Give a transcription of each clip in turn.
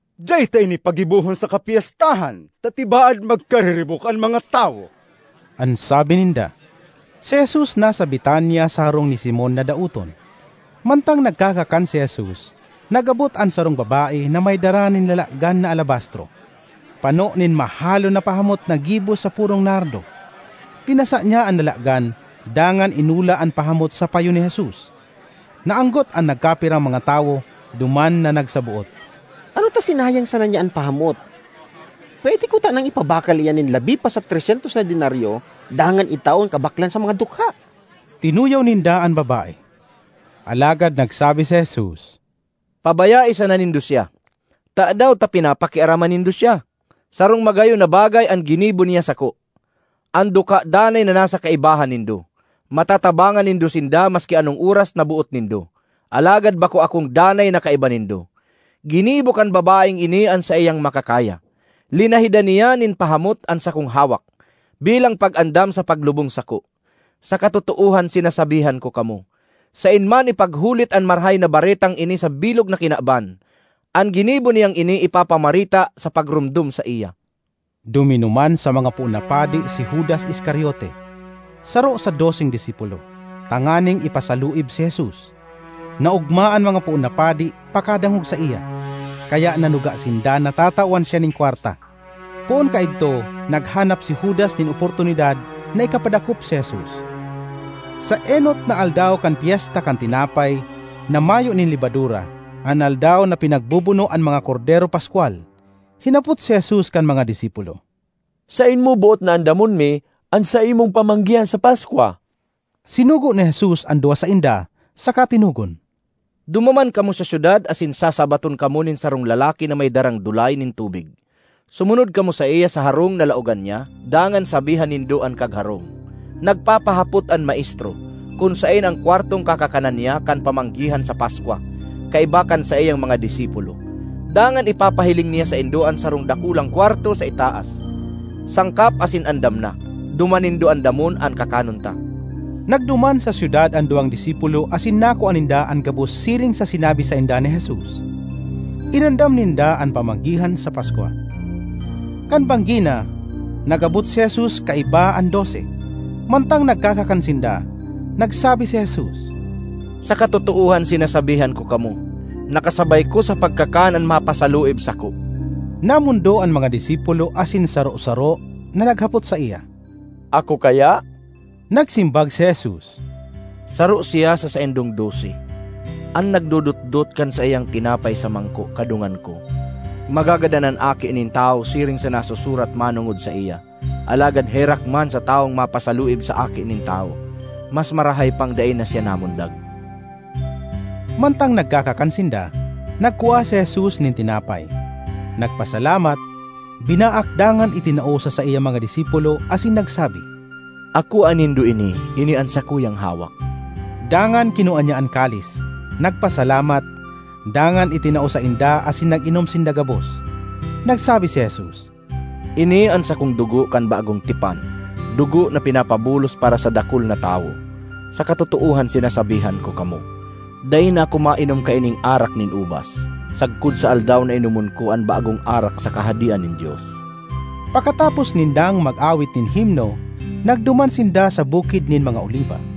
”Dai ta ini paggibohon sa kapyestahan ta tibaad magkariribok an mga tawo,” an sabi ninda. Si Jesus nasa Betania sa harong ni Simon na daoton. Mantang nagkakakan si Jesus, nag-abot an sarong babae na may dara nin lalagan na alabastro, pano nin mahalon na pahamot na gibo sa purong nardo. Pinasa niya an lalagan dangan inula an pahamot sa payo ni Jesus. Naanggot an nagkapirang mga tawo duman na nagsaboot, “Ano ta sinayang sana niya an pahamot? Pwede kutanang ipabakal iyan nin labi pa sa tres syentos na denaryo dangan itao an kabaklan sa mga dukha!” Tinuyaw ninda an babae. Alagad nagsabi si Jesus, “Pabayae sana nindo siya! Tadaw ta pinapakiaraman nindo siya? Sarong magayon na bagay an ginibo niya sako. An dukha danay na nasa kaibahan nindo; matatabangan nindo sinda maski anong oras na boot nindo. Alagad bako akong danay na kaiba nindo. Ginibo kan babaeng ini an saiyang makakaya: linahidan niya nin pahamot an sakong hawak bilang pag-andam sa paglubong sako. Sa katotoohan sinasabihan ko kamo, saen man ipaghulit an marahay na baretang ini sa bilog na kinaban, an ginibo niyang ini ipapamareta sa pagromdom saiya.” Duminuman sa mga poon na padi si Judas Iscariote, saro sa doseng disipulo, tanganing ipasaluib si Jesus. Naogma an mga poon na padi pakadangog saiya, kaya nanuga sinda na tatawan siya nin kwarta. Poon kaidto naghanap si Judas nin oportunidad na ikapadakop si Jesus. Sa enot na aldaw kan Pyesta kan Tinapay na Mayo nin Lebadura, an aldaw na pinagbobono an mga kordero paskwal, hinapot si Jesus kan mga disipulo, “Saen mo boot na andamon mi an saimong pamanggihan sa Paskwa?” Sinugo ni Jesus an duwa sainda saka tinugon, “Dumuman kamo sa syudad asin sasabaton kamo nin sarong lalaki na may darang dulay nin tubig. Sumunod kamo saiya sa harong na laogan niya dangan sabihan nindo an kagharong, ‘Nagpapahapot an Maestro kun saen an kwartong kakakanan niya kan pamanggihan sa Paskwa kaiba kan saiyang mga disipulo.’ Dangan ipapahiling niya saindo an sarong dakulang kwarto sa itaas, sangkap asin andam na. Duman nindo andamon an kakanon ta.” Nagduman sa syudad an duwang disipulo asin nakua ninda an gabos siring sa sinabi sainda ni Jesus. Inamdam (Inandam)ninda an pamanggihan sa Paskwa. Kan banggi na, nag-abot si Jesus kaiba an Dose. Mantang nagkakakan sinda, nagsabi si Jesus, “Sa katotoohan sinasabihan ko kamo, na kasabay ko sa pagkakan an mapasaluib sako.” Namondo an mga disipulo asin saro-saro na naghapot saiya, “Ako kaya?” Nagsimbag si Jesus, “Saro siya sa saindong dose, an nagdodotdot kan saiyang tinapay sa mangko kadungan ko. Magagadan an Aki nin Tawo siring sa nasusurat manongod sa saiya, alagad herak man sa tawong mapasaluib sa Aki nin Tawo. Mas marahay pang dai na siya namundag!” Mantang nagkakan sinda, nagkua si Jesus nin tinapay, nagpasalamat, binaak dangan itinao sa saiyang mga disipulo asin nagsabi, “Akoa nindo ini; ini an sakuyang hawak.” Dangan kinua niya an kalis, nagpasalamat, dangan itinao sainda asin nag-inom sinda gabos. Nagsabi si Jesus, “Ini an sakong dugo kan bagong tipan, dugo na pinapabulos para sa dakul na tawo. Sa katotoohan sinasabihan ko kamo, dai na ako mainom kaining arak nin ubas sagkod sa aldaw na inomon ko an bagong arak sa Kahadean nin Dios.” Pakatapos nindang mag-awit nin himno, nagduman sinda sa Bukid nin mga Oliba.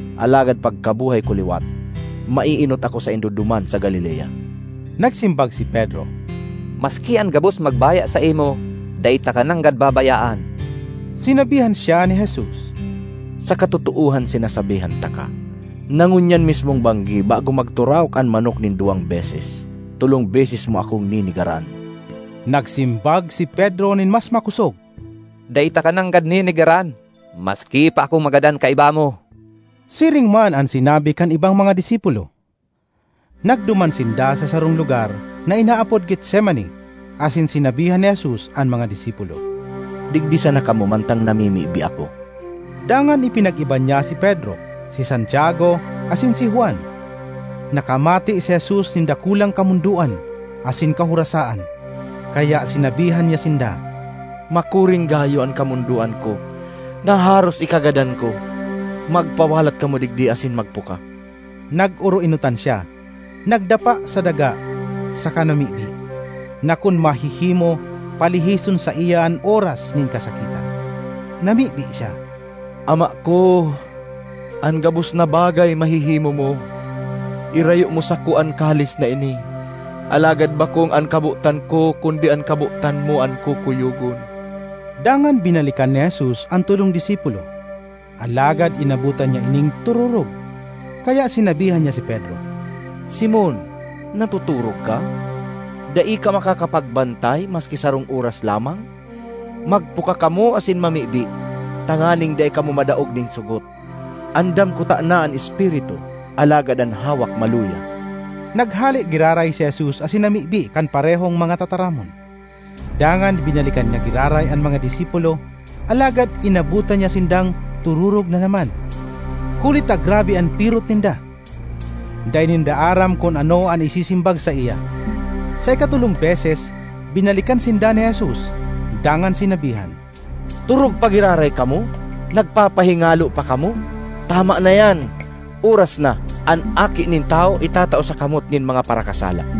Alagad pagkabuhay ko liwat, maeenot ako saindo duman sa Galilea.” Nagsimbag si Pedro, “Maski an gabos magbaya saimo, dai taka nanggad babayaan!” Sinabihan siya ni Jesus, “Sa katotoohan sinasabihan taka, na ngunyan mismong banggi bago magturaok an manok nin duwang beses, tolong beses mo akong nenegaran.” Nagsimbag si Pedro nin mas makosog, “Dai taka nanggad nenegaran, maski pa ako magadan kaiba mo!” Siring man an sinabi kan ibang mga disipulo. Nagduman sinda sa sarong lugar na inaapod Getsemani asin sinabihan ni Jesus an mga disipulo, “Digdi sana kamo mantang namimibi ako.” Dangan ipinag-iba niya si Pedro, si Santiago asin si Juan. Nakamate si Jesus nin dakulang kamondoan asin kahorasaan kaya sinabihan niya sinda, “Makuring gayo an kamondoan ko na haros ikagadan ko! Magpawalat kamo digdi asin magpuka.” Nag-oroenotan siya, nagdapa sa daga saka namibi, na kun mahihimo, palihison saiya an oras nin kasakitan. Namibi siya, “Ama ko! An gabos na bagay mahihimo mo. Irayo mo sako an kalis na ini. Alagad bakong an kabotan ko kundi an kabotan mo an kukuyogon.” Dangan binalikan ni Jesus an tolong disipulo, alagad inabotan niya ining tororog, kaya sinabihan niya si Pedro, “Simon, natotorog ka? Dai ka makakapagbantay maski sarong oras lamang? Magpuka kamo asin mamibi, tanganing dai kamo madaog nin sogot. Andam kutana an espiritu, alagad an hawak maluya.” Naghale giraray si Jesus asin namibi kan parehong mga tataramon. Dangan binalikan niya giraray an mga disipulo alagad inabotan niya sindang tororog na naman, huli ta grabe an pirot ninda. Dai ninda aram kun ano an isisimbag saiya. Sa ikatolong beses binalikan sinda ni Jesus dangan sinabihan, “Torog pa giraray kamo? Nagpapahingalo pa kamo? Tama na iyan! Oras na; an Aki nin Tawo itatao sa kamot nin mga parakasala.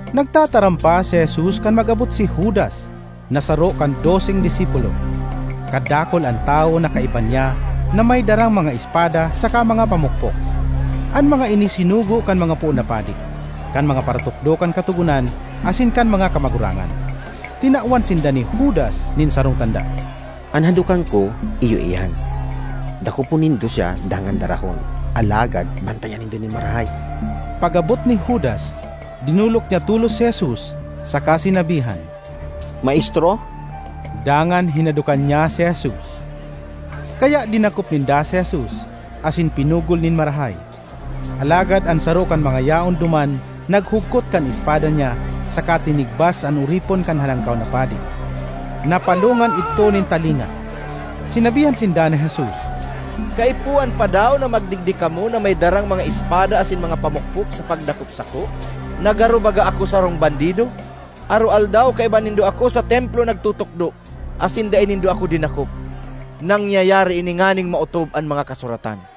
Nagtataram pa si Jesus kan mag-abot si Judas na saro kan doseng disipulo. Kadakul an tawo na kaiba niya na may darang mga espada saka mga pamukpok. An mga ini sinugo kan mga poon na padi, kan mga paratukdo kan Katogonan asin kan mga kamagurangan. Tinawan sinda ni Judas nin sarong tanda, “An hadokan ko iyo iyan. Dakopon nindo siya dangan darahon, alagad bantayan nindo nin marahay.” Pag-abot ni Judas, dinolok niya tolos si Jesus saka sinabihan, “Maestro!” Dangan hinadokan niya si Jesus. Kaya dinakop ninda si Jesus, asin pinugol nin marahay. Alagad an saro kan mga yaon duman naghugkot kan espada niya saka tinigbas an oripon kan Halangkaw na Padi; napalongan idto nin talinga. Sinabihan sinda ni Jesus, “Kaipuhan pa daw na magdigdi kamo na may darang mga espada asin mga pamukpok sa pagdakop sako, na garo baga ako sarong bandido? Aroaldaw kaiba nindo ako sa Templo nagtutukdo, asin dai nindo ako dinakop. Nangyayari ini nganing maotob an mga Kasuratan.”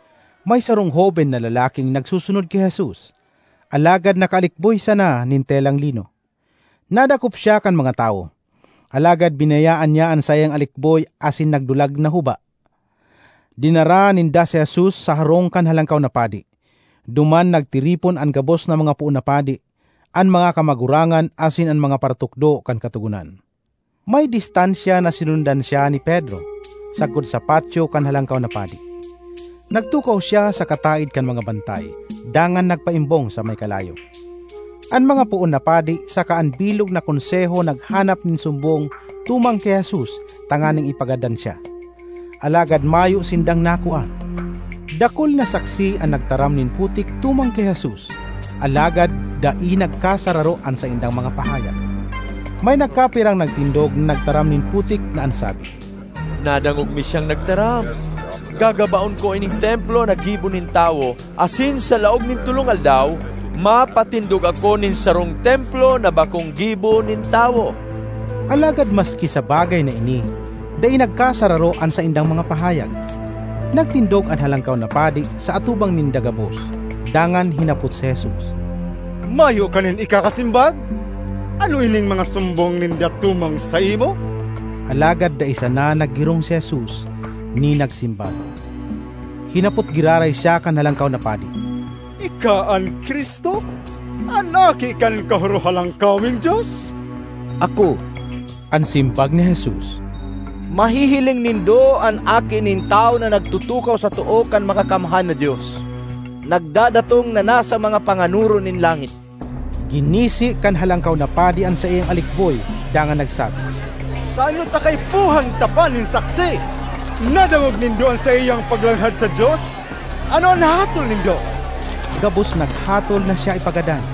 May sarong hoben na lalaking nagsusunod ki Jesus, alagad nakaalikboy sana nin telang lino. Nadakop siya kan mga tawo, alagad binayaan niya an saiyang alikboy asin nagdulag na huba. Dinara ninda si Jesus sa harong kan Halangkaw na Padi; duman nagtiripon an gabos na mga poon na padi, an mga kamagurangan asin an mga paratukdo kan Katogonan. May distansya na sinundan siya ni Pedro sagkod sa patyo kan Halangkaw na Padi. Nagtukaw siya sa kataed kan mga bantay dangan nagpaimbong sa may kalayo. An mga poon na padi saka an bilog na Konseho naghanap nin sumbong tumang ki Jesus tanganing ipagadan siya, alagad mayo sindang nakua. Dakul na saksi an nagtaram nin putik tumang ki Jesus, alagad dai nagkasararo an saindang mga pahayag. May nagkapirang nagtindog na nagtaram nin putik na an sabi, ”Nadangog mi siyang nagtaram: ‘Gagabaon ko ining Templo na gibo nin tawo, asin sa laog nin tolong aldaw mapatindog ako nin sarong Templo na bakong gibo nin tawo.’” Alagad maski sa bagay na ini, dai nagkasararo an saindang mga pahayag. Nagtindog an Halangkaw na Padi sa atubang ninda gabos dangan hinapot si Jesus, “Mayo ka nin ikakasimbag? Ano ining mga sumbong ninda tumang saimo?” Alagad dai sana naggirong si Jesus ni nagsimbag. Hinapot giraray siya kan Halangkaw na Padi, “Ika an Cristo, an Aki kan Kahorohalangkaweng Dios?” ”Ako!” an simbag ni Jesus. “Mahihiling nindo an Aki nin Tawo na nagtutukaw sa too kan Makakamhan na Dios, nagdadatong na nasa mga panganoron nin langit!” Ginisi kan Halangkaw na Padi an saiyang alikboy dangan nagsabi, “Tano ta kaipuhan ta pa nin saksi? Nadangog nindo an saiyang paglanghad sa Dios! Ano an hatol nindo?” Gabos naghatol na siya ipagadan.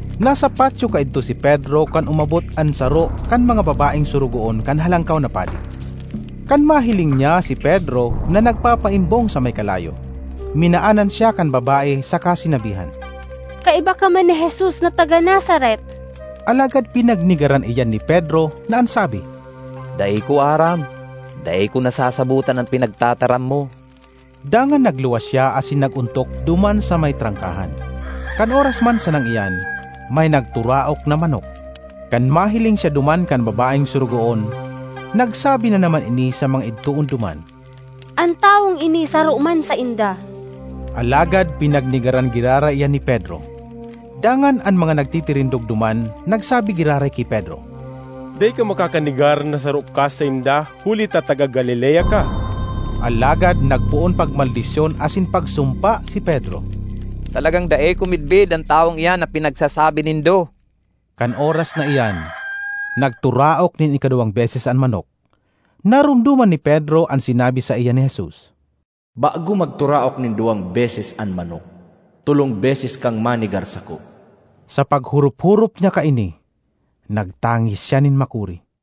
Nasa patyo kaidto si Pedro kan umabot an saro kan mga babaeng sorogoon kan Halangkaw na Padi. Kan mahiling niya si Pedro na nagpapaimbong sa may kalayo, minaanan siya kan babae saka sinabihan, “Kaiba ka man ni Jesus na taga-Nazaret.” Alagad pinagnegaran iyan ni Pedro na an sabi, “Dai ko aram…dai ko nasasabotan an pinagtataram mo.” Dangan nagluwas siya asin nag-ontok duman sa may trangkahan. (Kan oras man sanang iyan may nagturaok na manok.) Kan mahiling siya duman kan babaeng sorogoon, nagsabi na naman ini sa mga idtoon duman, “An tawong ini saro man sainda!” Alagad pinagnegaran giraray iyan ni Pedro. Dangan an mga nagtitirindog duman nagsabi giraray ki Pedro, “Dai ka makakanegar na saro ka sainda, huli ta taga Galilea ka.” Alagad nagpoon pagmaldisyon asin pagsumpa si Pedro, “Talagang dai ko midbid an tawong iyan na pinagsasabi nindo!” Kan oras na iyan nagturaok nin ikaduwang beses an manok; naromdoman ni Pedro an sinabi saiya ni Jesus, “Bago magturaok nin duwang beses an manok, tolong beses kang manegar sako.” Sa paghorop-horop niya kaini nagtangis siya nin makuri.